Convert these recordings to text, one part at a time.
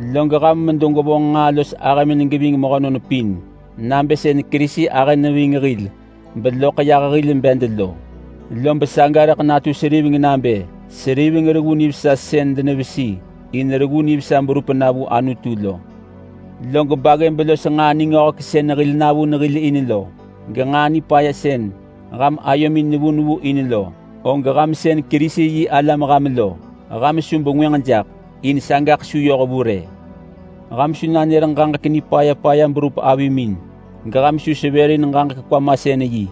Log ham medo gwevonġ nġaa los ahëmin geving mehönon pin, nabë sën Kerisi ahë neving hil beloḳ yah hil bed lo. Lob saga rëḳ natu seriveng nabë seriveng reggu nivesa sën denevesi in reggu nivesa berup na vu Anutu lo. Log baggëb los nġaa ningöhek sën hil navun hil in lo, genġaa nipaya sën ham ayomin nevu nevu in lo, og ham sën Kerisi-yi-alam ham lo, ham su bengwënġ jaḳ, in sagaḳ su yoh vu rë. Ham su nanër ġaġek nipaya paya berup avimin, geham su sevërin ġaġek kwamasën-yi,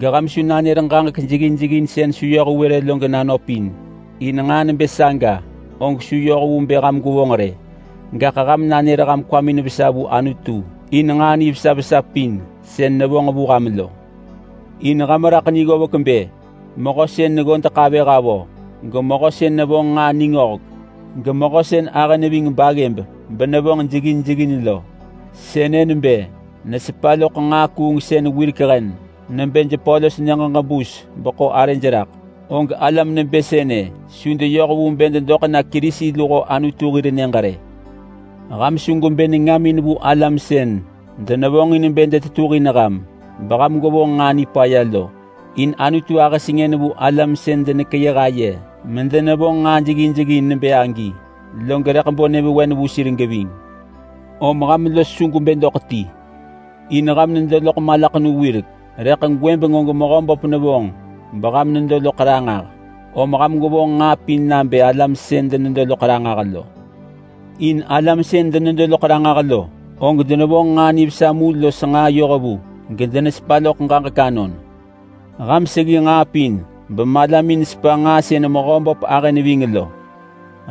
geham su nanër ġaġek jeggin jeggin sën su yoh vu rë lo genanöp in. In nġaa nebë saga og su yoh vu bë ham gwevonġ rë, gaḳ ham nanër ham kwamin vesa vu Anutu in nġaa nivesa vesa pin sën nevonġ vu ham lo. In ham raḳ ni ggovek bë mehö sën neggodeḳ avëh avö, gemehö sën nevonġ nġaa ningöhek, gemehö sën ahë neving baggëb benevonġ jeggin jeggin lo, sënë nebë nesepa loḳ nġaa kuungsën wirek hen nebë jepö los nyëġ ġebus beḳo arëj raḳ, og alam nebë sënë su deyoh vu bë dedoḳ na Kerisi luho Anutu hir nyëġ rë. Ham su gwebë nengamin vu alam sën denevonġin bë detetuhin ham beham gwevonġ nġaa nipaya lo. In Anutu ahë sengën vu alam sën denekeyëh aye medenevonġ nġaa jeggin jeggin nebë agi, log rëḳ bo nyëvewen vu sir geving. Om ham los su gwebë doḳ ti. In ham nedo loḳ malaḳenu wirek, rëḳ gwëbeng og Mehöböp nevonġ beham nedo loḳ ranġah, om ham gwevonġ nġaa pin nabë alam sën denedo loḳ ranġah lo. In alam sën denedo loḳ ranġah lo, og denevonġ nġaa nivesa mu los nġaa yohvu, gedenesepa loḳ ġaġek anon. Ham seggi nġaa pin bemalamin sepa nġaa sën Mehöböp ahë neving lo.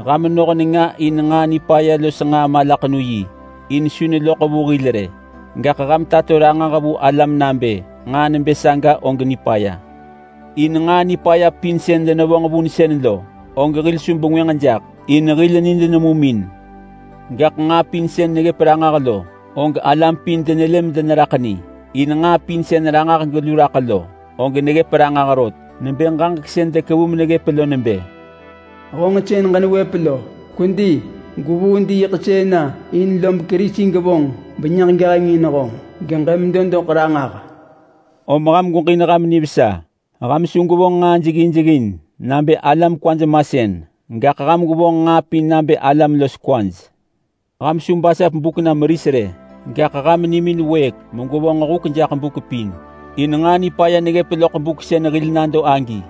Ham noh nenga in nġaa nipaya los nġaa malaḳenu-yi in su neloḳ vu hil rë, gaḳ ham tato ranġah vu alam nabë nġaa nebë saga og nipaya. In nġaa nipaya pin sën denevonġ vunsën lo, og hil su bengwënġ jaḳ, in hil nid nemum in. Gaḳ nġaa pin sën neggëp ranġah lo, og alam pin denelë medeneraḳ ni, in nġaa pin sën ranġah gelu raḳ lo, og neggëp ranġah rot. Nebë ġaġek sën dekevu meneggëp lo nebë: “Honġ sën ġenewëp lo! Kwedi! Gwevuu diiḳsën na in lob Kerisi gevonġ benyëġ geheng in honġ geġemedo doḳ ranġah!” Om ham gweġin ham nivesa. Ham su gwevonġ nġaa jeggin jeggin nabë alam kwaj masën, gaḳ ham gwevonġ nġaa pin nabë alam los kwaj. Ham su basap buk na meris rë, gaḳ ham nimin wëëk megwevonġ huk jaḳ buk pin, in nġaa nipaya neggëp loḳ buk sën hil nado agi.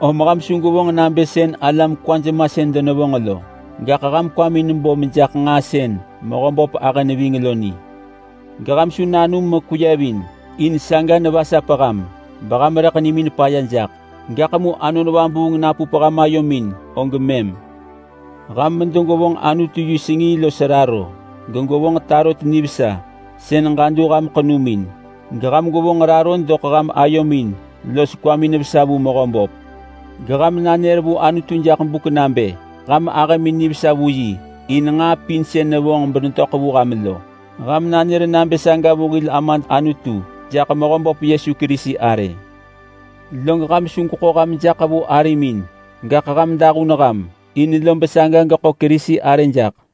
Om ham su gwevonġ nabë sën alam kwaj masën denevonġ lo, gaḳ ham kwamin bo mejaḳ nġaa sën Mehöböp ahë neving lo ni. Geham su nanum mekweyevin, in saga nevasap ham beham rëḳ nimin paya jaḳ, gaḳ mu Anon Vabuung napup ham ayomin og mëm. Ham medo gwevonġ Anutu yi sengii los raro, gegwevonġ tarot nivesa sën ġadu ham ḳenumin, geham gwevonġ raro doḳ ham ayomin los kwamin vesa vu Mehöböp. Geham nanër vu Anutu jaḳ buk nabë ham ahëmin nivesa vu yi in nġaa pin sën nevonġ benetöḳ vu ham lo. Ham nanër nabë saga vu hil Amad Anutu jaḳ Mehöböp Yesu Kerisi arë. Log ham su gweḳo ham jaḳ vu arimin, gaḳ ham dahun ham in lob saga geḳo Kerisi arë jaḳ.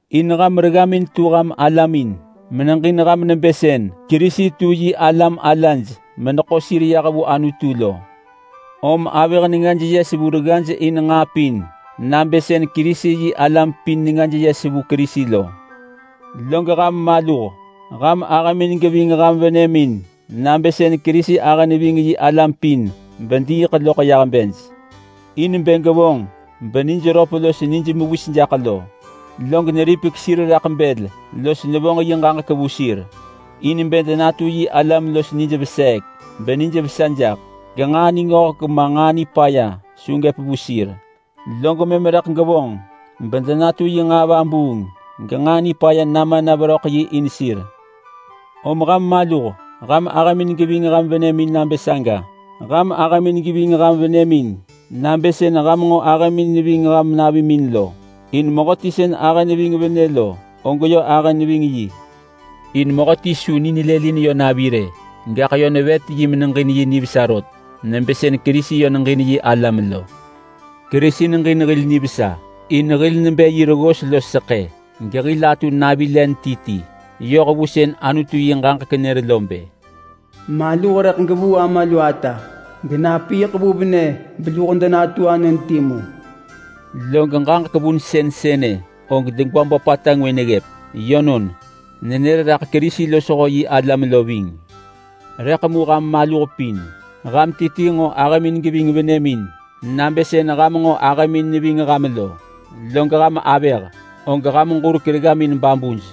In ham reggamin tu ham alamin meneġin ham nebë sën Kerisi tu yi alam alaj meneḳo sir yah vu Anutu lo. Om avëh nengaj yes vu reggaj in nġaa pin nabë sën Kerisi-yi-alam pin nengaj yes vu Kerisi lo. Log ham maluh! Ham ahëmin geving ham venëmin nabë sën Kerisi ahë neving yi alam pin bediiḳ loḳ yah bej in bë gevonġ benij röp los nij mewis jaḳ lo. Log neripek sir raḳ bël los nevonġ yi ġaġek vu sir, in bë denatu yi alam los nij veseek benijvesa jaḳ, genġaa ningöhek ma nġaa nipaya su gëp vu sir, log mëm rëḳ gevonġ bedenatu yi nġaa vabuung genġaa nipaya nama na veröḳ yi in sir. Om ham maluh! Ham ahëmin geving ham venëmin nabë saga. Ham ahëmin geving ham venëmin nabë sën ham nġo ahëmin neving ham navimin lo, in mehöti sën ahë neving venë lo, og yö ahë neving yi. In mehöti su ni nelëlin yö navi rë, gaḳ yö nevet yi meneġin yi nivesa rot nebë sën Kerisi yö neġin yi alam lo. Kerisi neġin hil nivesa in hil nebë yi reggos los seḳë gehil atu navi len ti ti. Yoh vu sën Anutu yi ġaġek nër lo bë, “Maluh rëḳ gevuu ama lu ata genapiiḳ vu venë beluho denatu anon timu.” Log ġaġek vunsën sënë og degwa böpata ngwë neggëp. Yönon, nenër raḳ Kerisi losho yi alam lo ving. Rëḳ mu ham maluh pin, ham ti ti nġo ahëmin geving venëmin nabë sën ham nġo ahëmin neving ham lo. Log ham avëh, og ham ġurek reggamin babuj.